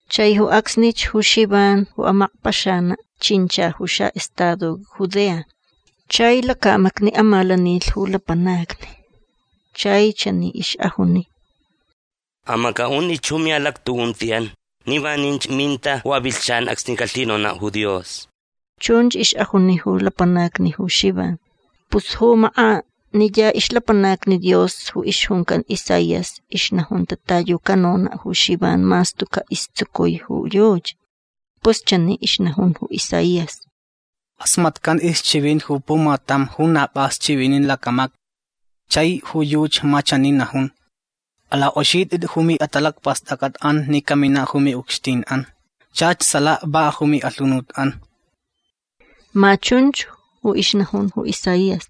Chai ju acsnich ju Xivan ju amakpaxanaʼ chincha ju xaʼestado Judea. Chai lacamacni amalanilh ju lapanacni. Chai chani ixʼajuni: ―Amacʼaʼuntʼit ju miʼalactuʼuntiʼan ni vaninch minta ju avilhchan acsni calhinonaʼ ju Dios. ―Chunch ixʼajuni ju lapanacni ju Xivan. Pus ju makʼaniya ixlapanac Dios ju ixjuncan Isaías ixnajunta ta yu canonaʼ ju Xivan mas tucaʼ istsucui ju yuchi. Pus chani ixnajun ju Isaías: Kʼasmatcan ixchivinti ju pumatam ju na pʼas chivinin lacamacni. Chai ju yuchi ma chani najun: Alakʼoxitʼit ju miʼatalacpastʼacʼatʼan ni caminaʼ ju miʼucxtinʼan. Chach salaka va ju miʼalhunutʼan. Ma chunch ju ixnajun ju Isaías.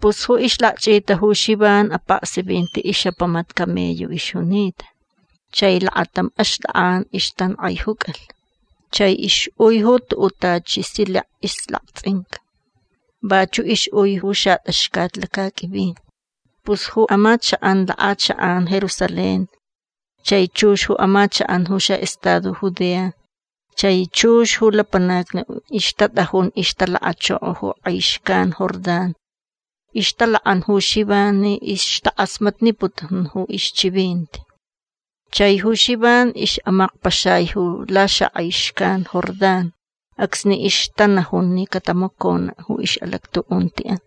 Pus ju ixlakchʼita ju Xivan apaksivinti ixʼapamat camello ixjunita. Chai lakatam axtʼakʼan ixtankʼaijucalh. Chai ixʼui ju tuʼuʼ tachi silek ixlaktsʼinca. Vachuʼ ixʼui ju xatʼaxcat lacaqʼuivin. Pus ju amachakʼan lakʼachakʼan Jerusalén chai chux ju amachakʼan ju xaʼestado Judea chai chux ju lapanacni ju ixtatʼajun ixtalakachoko ju kʼai xcan Jordán ixtalakʼan ju Xivan ni ixtakʼasmatniputun ju ixchivinti. Chai ju Xivan ixʼamakpaxai ju laxakʼai xcan Jordán acsni ixtanajun ni catamaconaʼ ju ixʼalactuʼuntiʼan.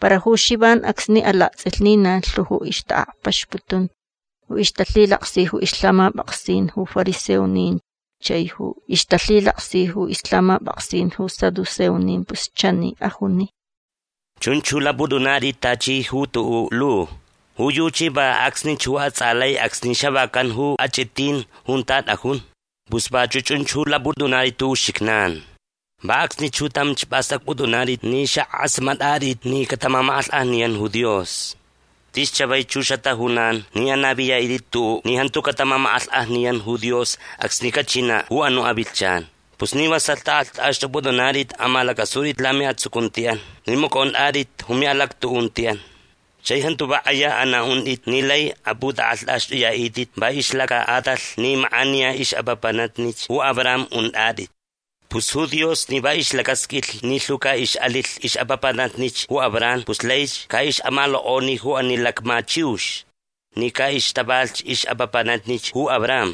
Para ju Xivan acsni alaktsʼilh ni na lhu ju ixtaʼakpaxputun ju ixtalhilaksi ju ixlhamapʼaksin ju fariseonin chai ju ixtalhilaksi ju ixlhamapʼaksin ju saduceonin pus chani ajuni: ―Chunch ju lapʼutʼunatʼit tachi ju tuʼuʼ lu. Ju yuchi va acsnich ju atsʼalai acsni xavacan ju achʼitin junta tʼajun. Pus vachuʼ chun ju lapʼutʼunatʼit ju uxijnan. Va acsnich ju tamch pʼastʼacpʼutʼunatʼit ni xakʼasmatʼatʼit ni catamamakʼalhkʼajniyan ju Dios. Tis chavaich ju xatajunan ni anaviyaʼitʼit tuʼuʼ ni jantu catamamakʼalhkʼajniyan ju Dios acsni cachinaʼ ju anuʼ avilhchan. Pus ni vasalh tʼakʼalhtʼaxtʼupʼutʼunatʼit amalacʼasutʼit lamiʼatsucuntiʼan ni macʼontʼatʼit ju miʼalactuʼuntiʼan. Chai jantu va kʼaya anaʼuntʼit ni lai apʼutʼakʼalhtʼaxtʼuyaʼitʼit va ixlacaʼatalh ni makʼaniya ixʼapapanatnich ju Abraham untʼatʼit. Pus ju Dios ni va ixlacasqʼuilh ni lhu caʼixʼalilh ixʼapapanatnich ju Abraham pus laich caʼixʼamalokʼoni ju ani lacma chiux ni caʼixtavalh ixʼapapanatnich ju Abraham.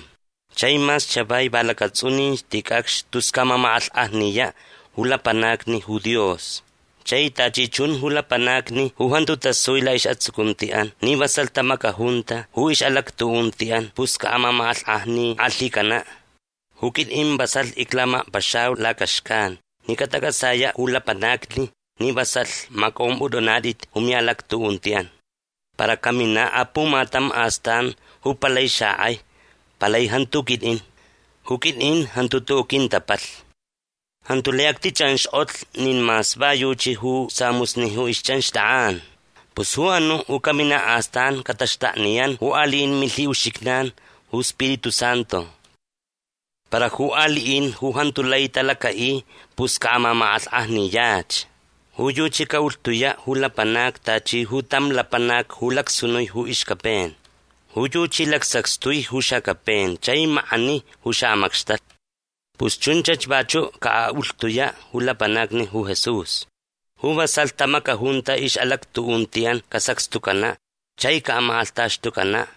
Chai mas chavai va lacatsʼunin ticʼacx tus caʼamamakʼalhkʼajniyaʼ ju lapanacni ju Dios. Chai tachi chun ju lapanacni ju jantu tasui laʼisʼatsucuntiʼan ni vasalh tamacajunta ju ixʼalactuʼuntiʼan pus caʼamamakʼalhkʼajnikʼalhicanaʼ. Ju quitʼin vasalh iclamakpaxayau lacaxcan ni catacʼatsayaʼ ju lapanacni ni vasalh macʼompʼutʼunatʼit ju miʼalactuʼuntiʼan. Para caminaʼ apumatam astan ju palai xakʼai. Palai jantu ju quitʼin. Ju quitʼin jantu tuʼuʼ quintapalhni. Jantu lai actichʼanxkʼotlh nin mas va yuchi ju samusni ju ixchʼanxtʼakʼan. Pus ju anuʼ ju caminaʼ astan cataxtakniyan ju aliʼin milhiʼuxijnan ju Spiritu Santu. Para ju aliʼin ju jantu lai talacaʼi pus caʼamamakʼalhkʼajniyach. Ju yuchi caʼulhtuyaʼ ju lapanacni tachi ju tam lapanac ju lacsunui ju ixcapen. Ju yuchi lacsacxtui ju xacapen chai makʼani ju xaʼamacxtalh. Pus chunchach vachuʼ caʼaʼulhtuyaʼ ju lapanacni ju Jesús. Ju vasalh tamacajunta ixʼalactuʼuntiʼan casacxtucanaʼ chai camakʼalhtaxtucanaʼ.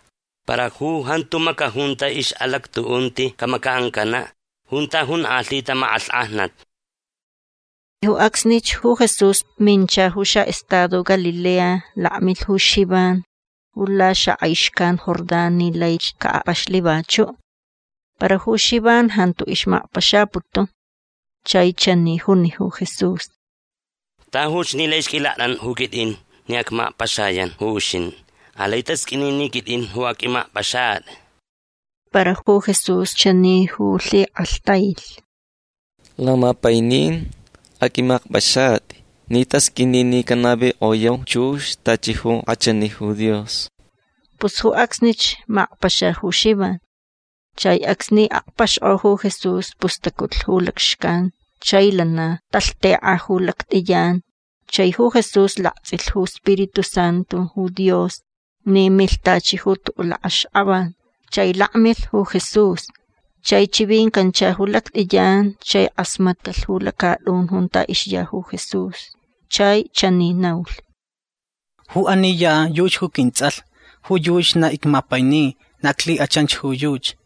Para ju jantu macajunta ixʼalactuʼunti camacaʼancanaʼ junta jonkʼalhita makʼalhkʼajnat. Ju acsnich ju Jesús mincha ju xaʼestado Galilea. Lakmilh ju Xivan ju laxakʼai xcan Jordán ni laich caʼakpaxlh vachuʼ. Para ju Xivan jantu ixmakpaxaputun. Chai chani juni ju Jesús: ―Tajuch ni laich qʼuilaktʼantʼa ju quitʼin ni acmakpaxayan ju uxintʼi. Alai tasqʼuini ni quitʼin ju aqʼuimakpʼaxatʼi. Para ju Jesús chani ju lhikʼalhtailh: ―Lamapainin aqʼuimakpʼaxatʼi ni tasqʼuini ni canavikʼoyau chux tachi ju kʼachani ju Dios. Pus ju acsnich makpaxa ju Xivan. Chai acsni akpaxkʼo ju Jesús pus tacutlh ju lacxcan chai lana talhtekʼa ju lactʼiyan chai ju Jesús laktsʼilh ju iSpiritu Santu ju Dios ni milh tachi ju tuʼuʼ lakʼaxkʼavan. Chai lakmilh ju Jesús. Chai chivincancha ju lactʼiyan chai kʼasmatcalh ju lacatʼun junta ixya ju Jesús. Chai chani naulh: ―Ju ani ya yuchi ju quintsʼalh. Ju yuchi na icmapaini. Na iclhikʼachanch ju yuchi.